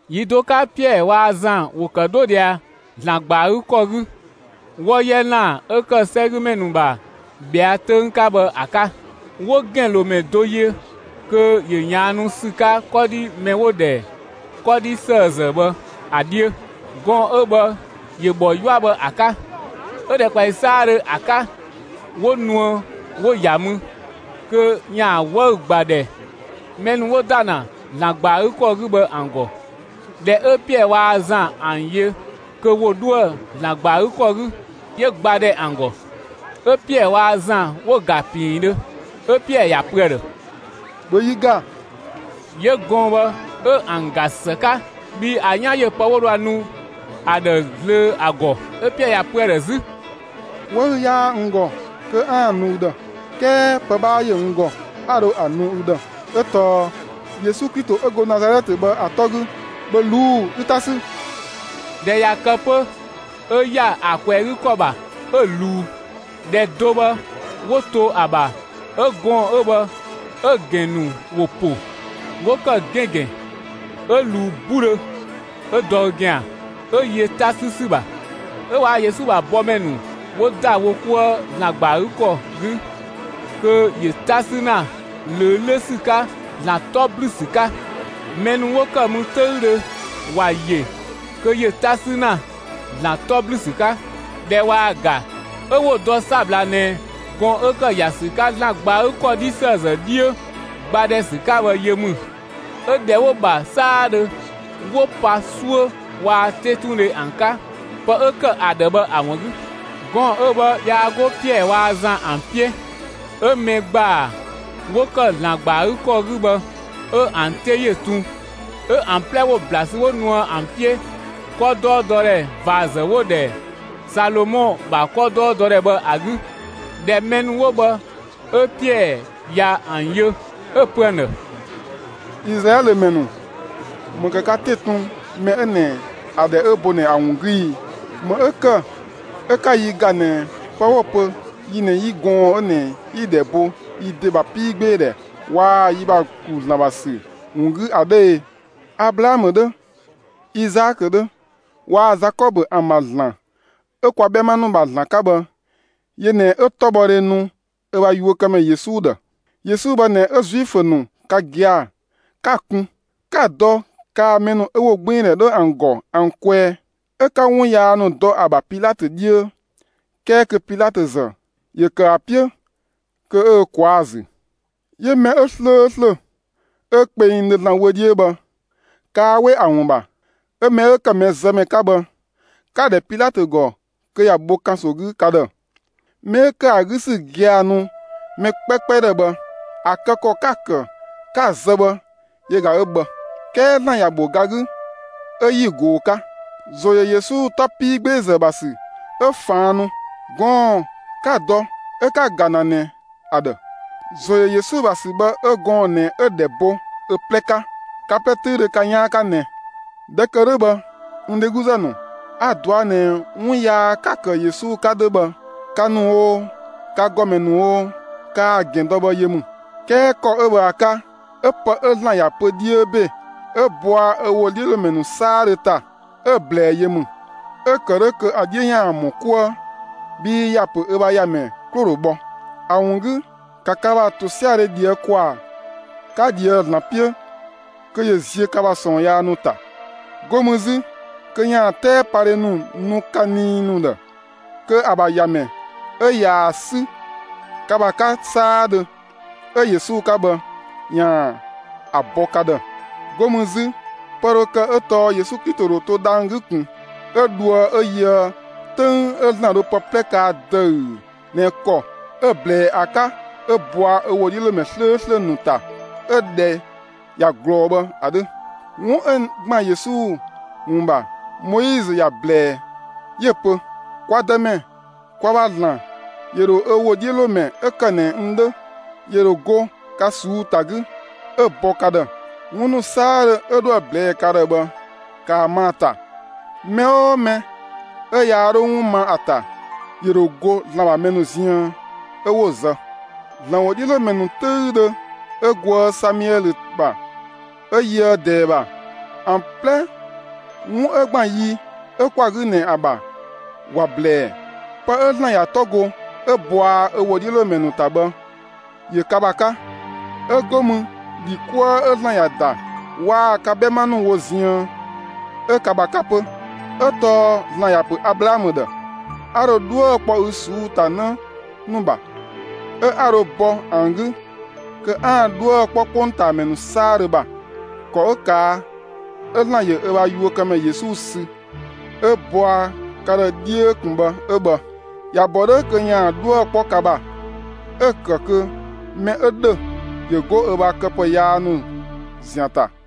Yi do 'ka Piɛɛ waa‑ Zan ‑wo ‑kë 'dho ꞊dhia ‑Zlan ‑gba ‑a 'gü ‑kɔ 'gü, 'wɔ 'yɛ ‑lan 'ö ‑kë 'sɛgümɛ ‑nu ‑bha ꞊bhɛa' 'töng 'ka bhë ‑a 'ka. 'Wo ‑gɛnlomɛ do yö kö ‑yö ꞊yaannu ‑sü 'ka 'kɔdhi mɛ 'wo‑ ‑dhɛ 'kɔdhi ‑sëëzë bhë ‑a 'dhiö. Gɔɔn‑ 'ö bhë ‑yö ‑bhɔ 'yua bhë ‑a 'ka. 'Ö ‑dhɛkpaɔyi 'saadhö ‑a 'ka, 'wo nuë 'wo‑ ‑ya mü, kö ‑yaan 'wëü‑ ‑gba ‑dhɛ, mɛ ‑nu 'wo ‑da ‑na ‑Zlan ‑gba ‑a 'gü ‑kɔ 'gü bhë ‑an ‑gɔ. ꞊Dhɛ 'ö Piɛɛ waa‑ Zan ‑an yö kö ‑wo 'dhoë‑ ‑Zlan ‑gba ‑a 'gü ‑kɔ 'gü, 'yö ‑gba ‑dhɛ ‑an ‑gɔ. 'Ö Piɛɛ waa‑ Zan 'wo‑ ‑ga ‑piindhö, 'ö Piɛɛ ‑ya pö ‑a ‑dhë: «‑Bhö yi ‑ga!» 'Yö gɔɔn‑ bhë 'ö ‑an ‑ga ‑së 'ka, bhii ‑a 'yan ‑yö pë 'wo dho ‑a nu ‑a ‑dhë zlöö ‑a ‑gɔ. 'Ö Piɛɛ ‑ya pö ‑a ‑dhë 'zü: «'Wëü‑ 'yaa n ‑gɔ kö 'aan‑ nu ü ‑dhë, 'kɛɛ pë 'bhaa ‑yö n ‑gɔ, 'a dho ‑a nu ü ‑dhë; ö tɔɔ: Yesu Klito 'ö go Nazalɛtë bhë ‑a 'tɔ 'gü, ‑bhö ꞊luu'‑ 'ü 'ta 'sü!» ꞊Dhɛ ꞊ya kë 'pö 'ö ‑ya ‑a ꞊kwɛɛ‑ 'gü ‑kɔ ‑bha 'ö‑ ꞊luu. ꞊Dhɛ do bhë 'wo to ‑a ‑bha 'ö gɔɔn‑ 'ö bhë 'ö‑ ‑gɛn ‑nu ‑wo ‑po, 'wo ‑kë 'gɛngɛn. 'Ö ꞊luu 'budhö, 'ö dɔ ö ‑gɛan, 'ö yö 'ta 'sü ‑sü ‑bha. 'Ö waa‑ Yesu ‑bha bɔmɛ ‑nu 'wo ‑da wo 'kuë ‑Zlan ‑gba ‑a 'gü ‑kɔ 'gü kö ‑yö 'ta 'sü ‑na ꞊löö 'lö ‑sü 'ka ‑Zlan 'tɔ ‑blü ‑sü 'ka. Mɛ ‑nu 'wo ‑kë mü 'töüdhö ‑wa ‑yö kö ‑yö 'ta 'sü ‑na ‑Zlan 'tɔ ‑blü ‑sü 'ka. ꞊Dhɛ ꞊waa‑ ‑ga 'ö 'wo‑ dɔ 'sabla ꞊nɛ gɔɔn‑ 'ö ‑kë ‑ya ‑sü 'ka ‑Zlan ‑gba ‑a 'gü ‑kɔ 'kɔdhi ‑sëëzë 'dhiö, ‑gba ‑dhɛ ‑sü 'ka bhë yö ‑mü. 'Ö ‑dhɛ 'wo‑ ‑bha 'saadhö 'wo pa 'suö waa‑ 'tetundhe ‑an 'ka, pë 'ö ‑kë ‑a ‑dhë bhë ‑a ‑wun 'gü. Gɔɔn‑ 'ö bhë yaa 'go Piɛɛ waa‑ Zan ‑an 'piö. 'Ö mɛ ‑gbaa 'wo ‑kë ‑Zlan ‑gba ‑a 'gü ‑kɔ 'gü bhë, 'ö ‑an 'te ‑yö tun, 'ö ‑an 'plɛ 'wo ‑bla sü 'wo nuë ‑an 'piö, 'kɔdɔɔdɔdhɛ ꞊vaazë 'wo‑ ‑dhɛ Salomɔ ‑bha 'kɔdɔɔdɔdhɛ bhë ‑a 'gü. ꞊Dhɛ mɛ ‑nu 'wo bhë 'ö Piɛɛ ꞊ya ‑an yö, 'ö‑ pö ‑an ‑dhë: «Izlaɛlö ‑mɛ ‑nu, ‑më ‑kë ka 'te‑ tun mɛ 'ö ꞊nɛ ‑a ‑dhɛ 'ö bo ꞊nɛ ‑a ‑wun 'gü i? ‑Më 'ö ‑kë 'ö 'ka yi ‑ga ꞊nɛ pë 'wo‑ pö yi ꞊nɛ 'yi gɔɔn‑ 'ö ꞊nɛ 'yi‑ ‑dhɛ bo yi ‑de ‑bha 'piigbeedhɛ waa‑ yi ‑bha ‑klu ‑Zlan ‑bha ‑sü ‑wun 'gü ‑a 'dhö e? Ablaamö 'dhö, Izaakö 'dhö waa‑ Zakɔbö ‑an ‑bha ‑Zlan 'ö kwa 'bhɛma ‑nu ‑bha ‑Zlan 'ka bhë, yö ꞊nɛ 'ö 'tɔbhɔdhe nu ö ‑bha yuökëmɛ Yesu ‑dhë. Yesu bhë ꞊nɛ 'ö Zuifö ‑nu ka gia‑ 'ka‑ kun, 'ka‑ dɔ kaa‑ mɛ ‑nu 'ö ‑wogbiindhɛ 'dhö ‑an ‑gɔ ‑an kwɛɛ, 'ö 'ka 'wun yaa ‑nu dɔ ‑a ‑bha Pilatö 'dhiö, 'kɛɛ kö Pilatö ‑zë, ‑yö ‑kë ‑a 'piö kö 'ö ö ꞊kwaa'‑ ‑zü. 'Yö mɛ 'ö 'slööslö, 'ö kpengdhö ‑Zlan wö 'dhiö bhë, kaa 'we ‑a ‑wun ‑bha, 'ö mɛ 'ö ‑kë mɛzëmɛ 'ka bhë, 'ka‑ ‑dhɛ Pilatö ‑gɔ kö ‑ya bho ‑kanso 'gü ka ‑dhë. Mɛ 'ö ‑kë ‑a 'gü ‑sü gia‑ nu mɛ 'kpɛkpɛ ‑dhë bhë, ‑a kë ‑kɔ 'ka‑ ‑kë 'ka‑ zë bhë yö ꞊ga 'ö bhë. 'Kɛɛ ‑Zlan ‑ya ‑bho ga 'gü 'ö 'yi‑ ꞊goo‑ 'ka. ‑Zo ‑yö Yesu 'tɔ 'piigbeezë ‑bha ‑sü 'ö ꞊faan' nu, gɔɔn‑ 'ka‑ dɔ 'ö 'ka‑ ‑ga ‑na ꞊nɛ ‑a ‑dhë. ‑Zo ‑yö Yesu ‑bha ‑sü bhë 'ö gɔɔn‑ ꞊nɛ 'ö‑ ‑dhɛ bo ö 'plɛ 'ka, ka 'plɛ 'töüdhö ka 'yaan 'ka ꞊nɛ. ꞊Dhɛ ‑kë 'dhö bhë, n dhegluzë ‑nu, a‑ dɔa ꞊nɛ 'wun yaa 'ka‑ ‑kë Yesu 'ka 'dhö bhë, ka ‑nu oo, ka ‑gɔmɛ ‑nu oo, kaa‑ ‑gɛn dɔ bhë yö ‑mü. 'Kɛɛ ‑kɔ 'ö bhë ‑a 'ka, 'ö pë 'ö ‑Zlan ‑ya pö 'dhiö ‑be 'ö bɔa ö ‑wodhiölomɛ ‑nu 'saadhö ‑ta, 'ö‑ ꞊blɛɛ yö ‑mü; 'ö‑ ‑kë 'dhö kö ‑yaan 'dhiö ‑yaan ‑mɔ 'kuë bhii ‑ya pö ö bha ‑Yamɛ 'klo‑ ‑dho bhɔ. ‑A ‑wun 'gü ‑ka ka ‑bha ‑tosiadhe ꞊dhië' ‑kwaa, 'ka ꞊dhië'‑ ‑Zlan 'piö kö ‑yö ziö ka ‑bha ꞊sɔɔn yaa ‑nu ‑ta. 'Go mü 'zü kö ‑yaan 'tɛɛpadhe ‑nu nu ka nii ‑nu ‑dhë kö ‑a ‑bha ‑Yamɛ 'ö ꞊yaa‑ 'sü ka ‑bha 'ka 'saadhö, 'ö Yesu 'ka bhë, ‑yaan ‑a bɔ ka ‑dhë. 'Go mü 'zü pë dho kë 'ö tɔɔ Yesu Klito ‑dho to dhang‑ 'gü ꞊kun 'ö dhoë 'ö yöë 'töng 'ö ‑Zlan dho pë 'plɛ kaa ‑dëü ꞊nɛ ‑kɔ 'ö‑ ꞊blɛɛ ‑a 'ka 'ö bɔa ö ‑wodhiölomɛ 'slööslö ‑nu ‑ta 'ö‑ ‑dhɛ ꞊ya ꞊glɔɔ bhë ‑a 'dhö. 'Wun 'ö ‑gban Yesu ‑wun ‑bha, Moizö ‑ya ꞊blɛɛ 'yö‑ pö: Kwa Dëmɛ, kwa ‑bha ‑Zlan ‑yö ‑dho ö ‑wodhiölomɛ 'ö ‑kë ꞊nɛ n 'dhö, 'yö dho go ka ꞊suu'‑ ‑ta 'gü 'ö‑ bɔ ka ‑dhë. 'Wun ‑nu 'saadhö 'ö 'dhoë‑ ꞊blɛɛ' ka ‑dhë bhë, ‑kaa ma ‑a ‑ta! Mɛ 'oo mɛ 'ö yaa dho 'wun ma ‑a ‑ta, ‑yö ‑dho go ‑Zlan ‑bha mɛ ‑nu ziën, 'ö 'wo‑ zë. ‑Zlan ‑wodhiölomɛ ‑nu 'töüdhö 'ö goë Samiɛlö ‑bha 'ö yöë ꞊dɛɛ ‑bha, ‑an 'plɛ 'wun 'ö ‑gban yi 'ö 'kwa‑ 'gü ꞊nɛ ‑a ‑bha, ‑wa ꞊blɛɛ. Pë 'ö ‑Zlan ‑ya 'tɔ go 'ö bɔa ö ‑wodhiölomɛ ‑nu ‑ta bhë, ‑yö ka ‑bha 'ka, 'ö 'go mü ‑dhi 'kuë 'ö ‑Zlan ‑ya ‑da waa‑ ka 'bhɛma ‑nu wo ziën, 'ö ka ‑bha 'ka 'pö; 'ö tɔɔ ‑Zlan ‑ya ‑pö Ablaamö ‑dhë: ‹A ‑dho 'dhuë‑ kpɔ ü ꞊suu'‑ ‑ta 'në ‑nu ‑bha, 'ö 'a dho bɔ ‑an 'gü kö 'aan‑ 'dhuë‑ kpɔ 'kpongtaamɛ ‑nu 'saadhö ‑bha.› ‑Kɔ 'ö ꞊kaa' 'ö ‑Zlan ‑yö ö bha yuökëmɛ Yesu sü 'ö‑ bɔa ka ‑dhë 'dhiö ꞊kun bhë 'ö bhë. ‑Ya ‑bɔ 'dhö kö ‑yaan 'dhuë‑ 'kpɔ ka ‑bha 'ö‑ ‑kë kö mɛ 'ö ‑dhö ‑yö 'go ö ‑bha këpë yaa ‑nu ‑zian ‑ta.»